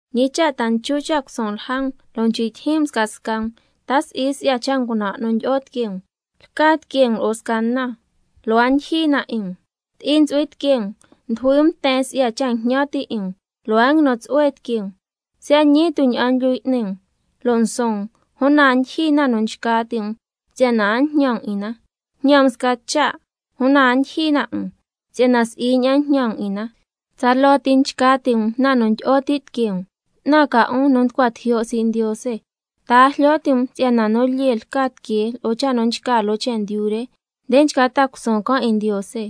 ¿Ñi cha' ta nchu cha' cusuun lja um, lo' nchcui' tyijyin um scasca um? ¿Ta si'i si'ya cha' ngunan' nu ndyi'o tiquee um? Lca tiquee um lo'o sca na, lo' a ndyijyi na 'in um. Ti'i ntsu'hui tiquee um, ndujui um nten si'ya cha' jñan ti' 'in um, lo' a nguinu tsu'hue tiquee um. Siya' ñii tu' ña'an nguilyu y'ni um lo' nsuun um, una a ndyijyi na nu nchca ti' um si'yana a njñan um 'in na. Njñan um sca cha', una a ndyijyi na 'in um, si'yana si'i ña'an njñan um 'in na, tsaloo ti nchca ti' um na nu ndyi'o ti tiquee um. ¡'Tnan ca 'un nu nducua tijyo' sii' Ndiose! ¿Ta a jlyo ti' um si'yana nu lyee lca tiquee lo'o cha' nu nchca loo chendyu re, nde nchca ta'a cusuun can' 'in Ndiose?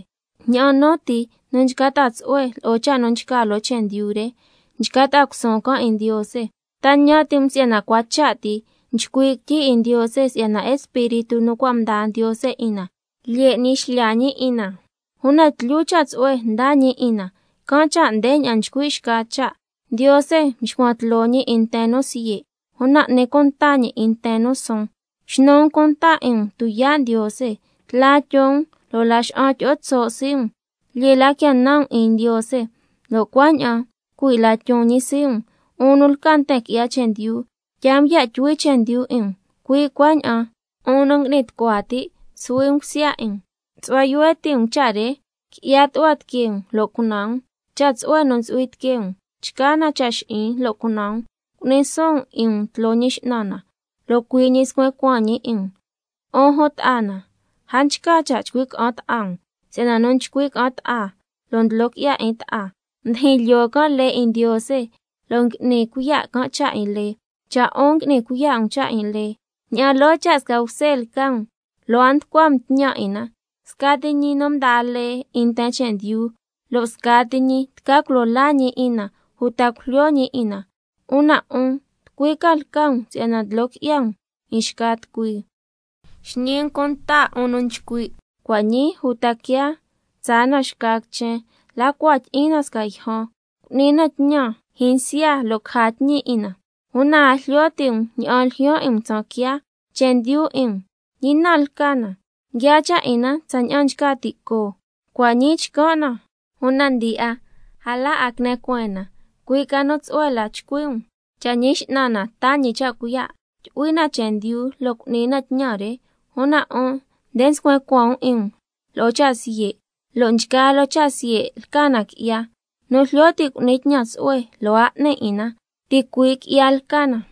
Ña'an nu ti nu nchca ta'a tsu'hue lo'o cha' nu nchca loo chendyu re, nchca ta'a cusuun can' 'in Ndiose. ¿Ta ñan ti' um si'yana cua cha' ti nchcui' quityi 'in Ndiose si'yana Espíritu nu cua' mdaa Ndiose 'in na, lyee n'ni xlya ñi 'in na? Una tlyu cha' tsu'hue ndaa ñi 'in na, can' cha' ndeña'an nchcui' xca cha': —Ndiose nxcuan tloo ñi 'in nten nu siye', una n'ni cunta ñi 'in nten nu suun—. Xnu um cunta 'in um tuyaa' Ndiose, tla tyon um lo' laxa'an tyi'o tso' sii' um. Lyee la quia nan um 'in Ndiose, lo' cuaña'an cui' la tyon ñi sii' um. 'Un nu lca nten qui'ya chendyu, tyaa um ya' tyuhui chendyu 'in um, cui' cuaña'an 'un nu ngui'ni tucua ti', suhui um cusya 'in um. Su'hua yuhue ti' um cha' re, qui'ya tu'hua tiquee um lo' cunan um. Cha' tsu'hue nu ntsu'hui tiquee um chca na cha' xi'in lo' cunan um. Cu'ni suun um 'in um tloo Ñi X'nan na, lo' cui' ñi scuen cuaan ñi 'in um. 'Un jun ta'a na, a nchca cha' chcui' ca'an ta'a um, si'yana nu nchcui' ca'an ta'a lo' ndlo qui'ya 'in ta'a, ndijin lyoo can' lee 'in Ndiose lo' ngui'ni cuiya' can' cha' 'in lee. Cha' 'un ngui'ni cuiya' um cha' 'in lee, ña'an loo cha' sca bse lca um, lo' a nducua um tñan 'in na. Scati ñi nu mdaa lee 'in nten chendyu, lo' scati ñi tca culo laa ñi 'in na uta cujlyo ñi 'in na. Una 'un, ¿tucui ca lca um si'yana ndlo qui'ya um 'in xca tucui? Xñi um cunta 'un nu nchcui': Cua' ñii uta quiaa tsaa na xca quichen, la cua tyi'in na sca yjan, cu'ni na tñan jyinsya lo' caja tñi 'in na. Una a jlyo ti' um ña'an ljyaan 'in um tsaan quiaa. Chendyu 'in um, ¿ñi na lca na? Nguiaa cha' 'in na tsaña'an nchca ti' coo, cua' ñii chcan' na, una ndi'a a la 'a quine cueen na. Cui' ca nu tsu'hue la chcui' um: Cha' Ñi X'nan na taa ñi cha' cuiya', tyu'hui na chendyu lo' cu'ni na tñan re. Una 'un nde nscuen cuaan um 'in um lo'o cha' siye', lo' nchgaa loo cha' siye' lca na qui'ya. Nu jlyo ti' cu'ni tñan tsu'hue lo' a n'ni 'in na, ticui' qui'ya lca na.